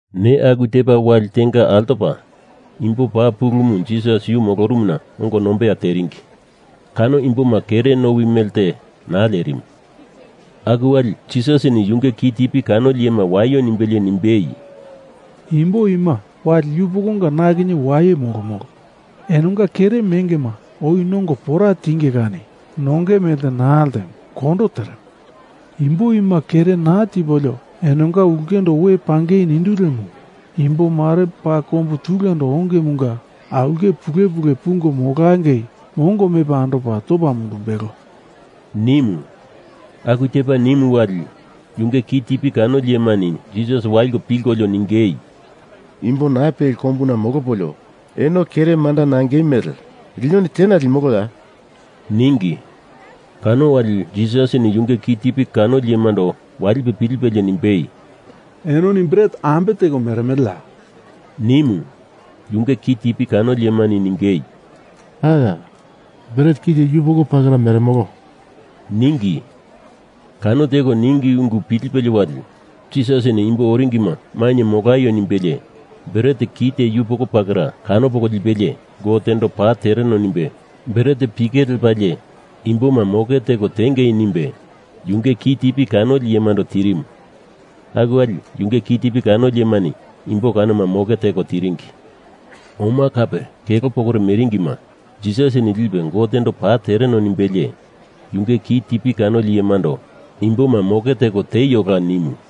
Neya aku tepa wali tenga altopa imbo paa pulumu Jisas yu molorumuna ongo nombeya teringi. Kano imboma kere nowi melte naa lerimu. Aku wali Jisasini yunge kitipi kanoli iyema waio nimbelie nimbei, “Imbo ima wali yupokonga na kinye waye molomolo. Enonga kere mengema oi nongo pora tinge kani nongei melte naa ltemo kondo teremo. Imbo ima kere naa tipolio enonga ulkendo we pangei nindu lemo, imbomare paa kombu tulendo ongemunga aulke pulepule pungo molangei mongo mepa andopa topa mundumbelo,” nimu. Aku tepa nimu wali, yunge kitipi kanoli iyemani Jisas waliko pilkolio ningei, “Imbo naa peli kombuna molopolio eno kere manda nangei mele linoni tena limoloya?” ningi. Kano wali, Jisasini yunge kitipi kanoli iyemando walipe pilipelie nimbei, “Enoni bret ambe teko meremeleya,” nimu. Yunge kitipi kanoli iyemani ningei, “Aya! Bret kite yupoko pakera meremolo,” ningi. Kano teko ningi ungu pilipelie wali, Jisasini imbo oringima mainye molaio nimbelie bret kite yupoko pakera kano poko lipelie, Gotendo paa tereno nimbe bret pike lepalie imboma moke teko tiengi nimbe, yunge kitipi kanoli iyemando tirimu. Aku wali, yunge kitipi kanoli iyemani imbo kanoma moke teko tiringi. Oma kape kelo pokore meringima, Jisasini lipe Gotendo paa tereno nimbelie, yunge kitipi kanoli iyemando imboma moke teko tieiola nimu.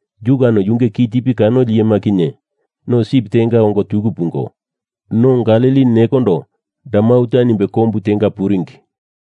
yu kano yunge kitipi kanoli iyema kinye, no sip tenga ongo tuku pungo, no Galili nekondo Dalmanuta nimbe kombuna puringi.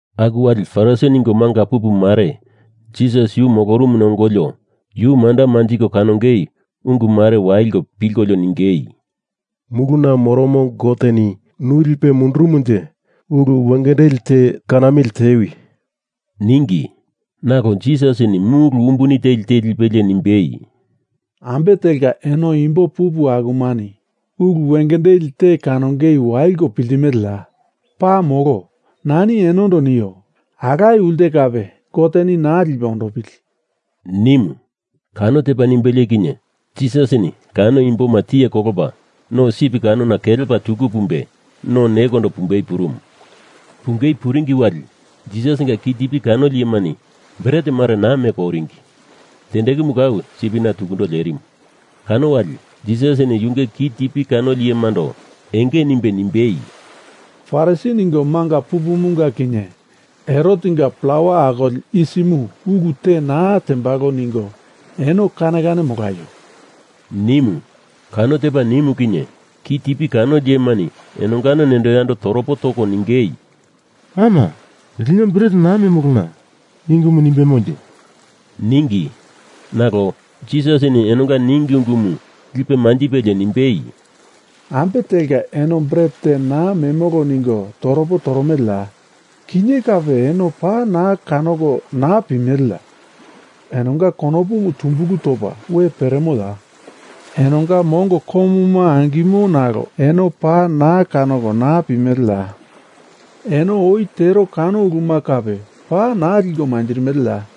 Aku wali Farisi ningo manga pupu mare Jisas yu molorumuna ongolio yu manda manjiko kanongei ungu mare waliko pilkolio ningei, “Muluna moromo Goteni nu lipe mundurumunje ulu wengendeli te kanamili tewi,” ningi. Nalo Jisasini mulu umbuni teli te lipelie nimbei, “Ambe telka eno imbo pupu akumani ulu wengendeli te kanongei waliko piltimeleya? Paa molo, nani enondo nio, alaye ulte kape Goteni naa lipe ondopili,” nimu. Kano tepa nimbelie kinye Jisasini kano imboma tiye kolopa, no sip kanona kelepa tuku pumbe, no nekondo pumbei purumu. Pungei puringi wali, Jisasinga kitipi kanoli iyemani bret mare naa meko oringi. Tendekumu kau sipina tukundo lerimu. Kano wali, Jisasini yunge kitipi kanoli iyemando enge nimbei nimbei, “Farisi ningo manga pupumunga kinye Herotenga plawa akoli yisimu ulu te naa tembalo ningo eno kane kane molaio,” nimu. Kano tepa nimu kinye, kitipi kanoli iyemani enongano nendo yando toropo toko ningei, “Ama! Lino bret naa memolona, i ungumu nimbemonje,” ningi. Nalo, Jisasini enonga ningi ungumu lipe manjipelie nimbei, “Ambe telka eno bret te naa memolo ningo toropo toromeleya? Kinye kape, eno paa naa kanoko naa pimeleya? Enonga konopumu tumbulu topa we peremoya? Enonga mongo komuma angimo nalo eno paa naa kanoko naa pimeleya? Eno oi tero kano uluma kape paa naa liko manjirimeleya?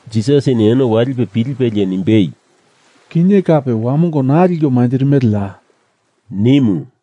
Jisasini eno walipe pilipelie nimbei, “Kinye kape wamongo naa liko manjirimeleya?” nimu.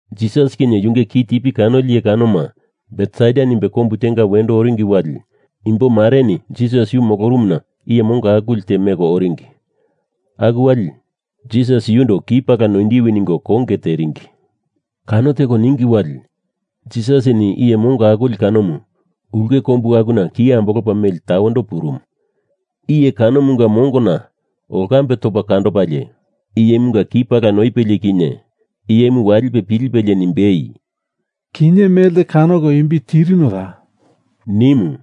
Jisas kinye yunge kitipi kanoli iye kanoma Betsaida nimbe kombu tenga wendo oringi wali, imbomareni Jisas yu molorumuna iye mongo akuli te meko oringi. Aku wali Jisas yundo ki pala noindiwi ningo konge teringi. Kano teko ningi wali, Jisasini iye mongo akuli kanomu ulke kombu akuna ki ambolopa meli tawendo purumu. Iye kanomunga mongona olkambe topa kandopalie, iyemunga ki pala noipelie kinye iyemu walipe pilipelie nimbei, “Kinye melte kanoko imbi tirinoya?” nimu.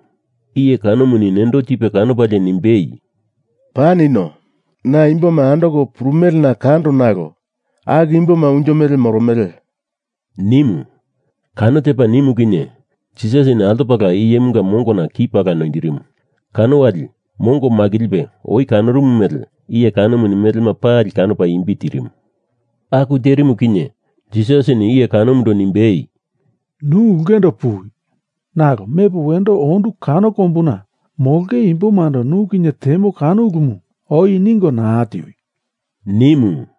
Iye kanomuni nendo tipe kanopalie nimbei, “Paa nino, na imboma andoko purumelena kando nalo, aku imboma unjo mele moromele,” nimu. Kano tepa nimu kinye, Jisasini altopala iyemunga mongona ki pala noindirimu. Kano wali, mongo makilipe oi kanorumu mele iye kanomuni melema pali kanopa imbi tirimu. Aku terimu kinye, Jisasini iye kanomundo nimbei, “Nu ulkendo puwi. Nalo mepo wendo ondu kano kombuna molonge imbomando nu kinye temo ulumu oi ningo naa tiwi,” nimu.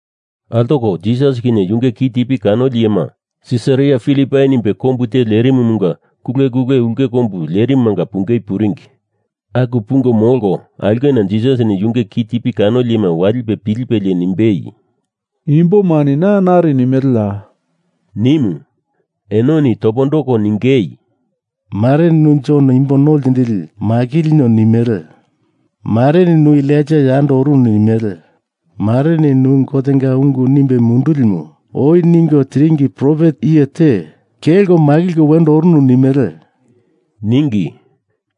Altoko Jisas kinye yunge kitipi kanoli iyema Sisaria Filipai nimbe kombu te lerimumunga kulekule ulke kombu lerimumanga pungei puringi. Aku pungo molko aulkena Jisasini yunge kitipi kanoli iyema walipe pilipelie nimbei, “Imbomani na nari nimeleya?” nimu. Enoni topondoko ningei, “Mareni nu Jon Imbo No Ltindili makilinio nimele. Mareni nu Elaija yando orunu nimele. Mareni nu Gotenga ungu nimbe mundulimu oi ningo tiringi profet iye te kelko makilko wendo orunu nimele,” ningi.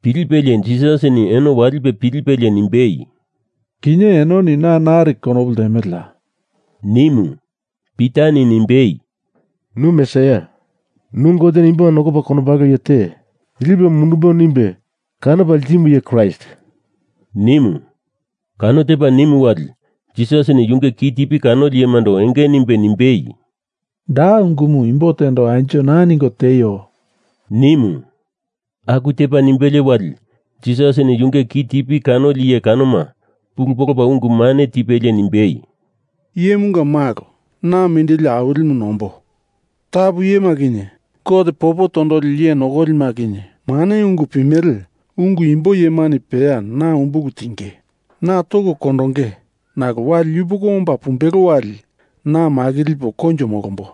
Pilipelie Jisasini eno walipe pilipelie nimbei, “Kinye enoni na nari konopu ltemeleya?” nimu. Pitani nimbei, “Nu Mesaia, nu Goteni imboma nokopa kondombalo iye te lipo mundumbo nimbe kanopa ltimu iye Kraist,” nimu. Kano tepa nimu wali, Jisasini yunge kitipi kanoli iyemando enge nimbe nimbei, “Da ungumu imbo tendo anjo naa ningo tieio,” nimu. Aku tepa nimbelie wali, Jisasini yunge kitipi kanoli iye kanoma pulu polopa ungu mane tipelie nimbei, “Iyemunga Malo, na mindili awilimu nombo. Tapu iyema kinye, Gote popo tondoli iye nokolima kinye, mane ungu pimele ungu imbo iyemani peya na umbulu tinge. Na toko kondonge, nalo wali yupoko ombo pumbelo wali na makilipo koinjo molombo,”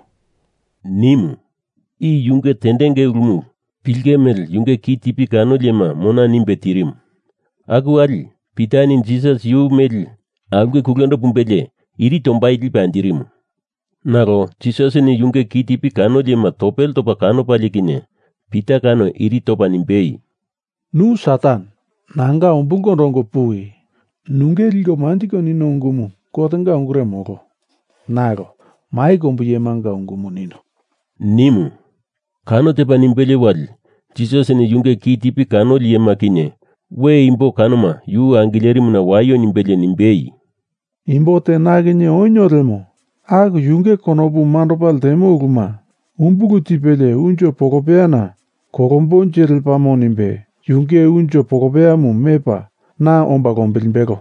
nimu. I yunge tendenge ulumu pilinge mele yunge kitipi kanoli iyema mona nimbe tirimu. Aku wali, Pitani Jisas yu meli aulke kulendo pumbelie iri tombai lipe anjirimu. Nalo Jisasini yunge kitipi kanoli iyema topele topa kanopalie kinye, Pita kano iri topa nimbei, “Nu Satan, nanga umbulkondo ongo puwi. Nunge liko manjiko nino ungumu Gotenga ungure molo, nalo mai kombu iyemanga ungumu nino,” nimu. Kano tepa nimbelie wali, Jisasini yunge kitipi kanoli iyema kinye we imbo kanoma yu angilerimuna waio nimbelie nimbei, “Imbo te na kinye onio lemo, aku yunge konopu mandopa ltemo uluma umbulu tipelie unjo polopeyana kolombonje lepamo nimbe yunge unjo polopeyamu mepa na omba lombilimbelo.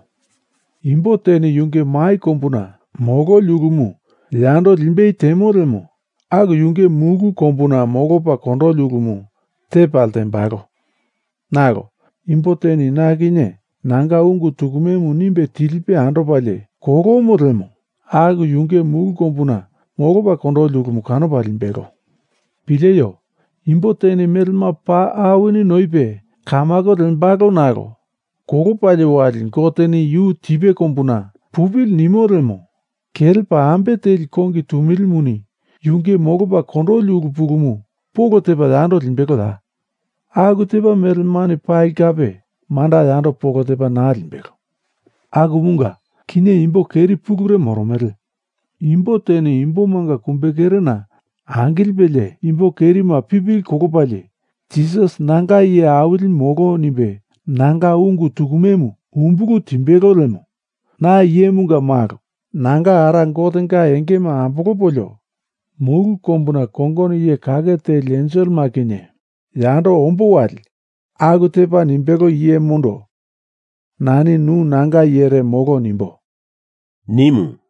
Imbo teni yunge mai kombuna mololi ulumu yando limbei temo lemo, aku yunge mulu kombuna molopa kondoli ulumu tepa ltembalo, nalo imbo teni na kinye nanga ungu tukumemu nimbe tilipe andopalie kolomo lemo, aku yunge mulu kombuna molopa kondoli ulumu kanopa limbelo. Pileio! Imbo teni mele paa awini noipe kamako lembalo nalo kolopalie wali Goteni yu tipe kombuna pupili nimo lemo, kelepa ambe teli kongi tumilimuni yunge molopa kondoli ulu pulumu polo tepa yando limbeloya? Aku tepa melemani pali kape manda yando polo tepa naa limbelo. Akumunga kinye imbo keri pulure moromele. Imbo teni imbomanga kumbekerena angilipelie imbo kerima pipili kolopalie Jisas nanga iye awili molo nimbe nanga ungu tukumemu umbulu timbelo lemo, na Iyemunga Malo nanga Ara Gotenga engema ambolopolio mulu kombuna kongono iye kake teli enselema kinye yando ombo wali aku tepa nimbelo iyemundo nani nu nanga iyere molo nimbo,” nimu.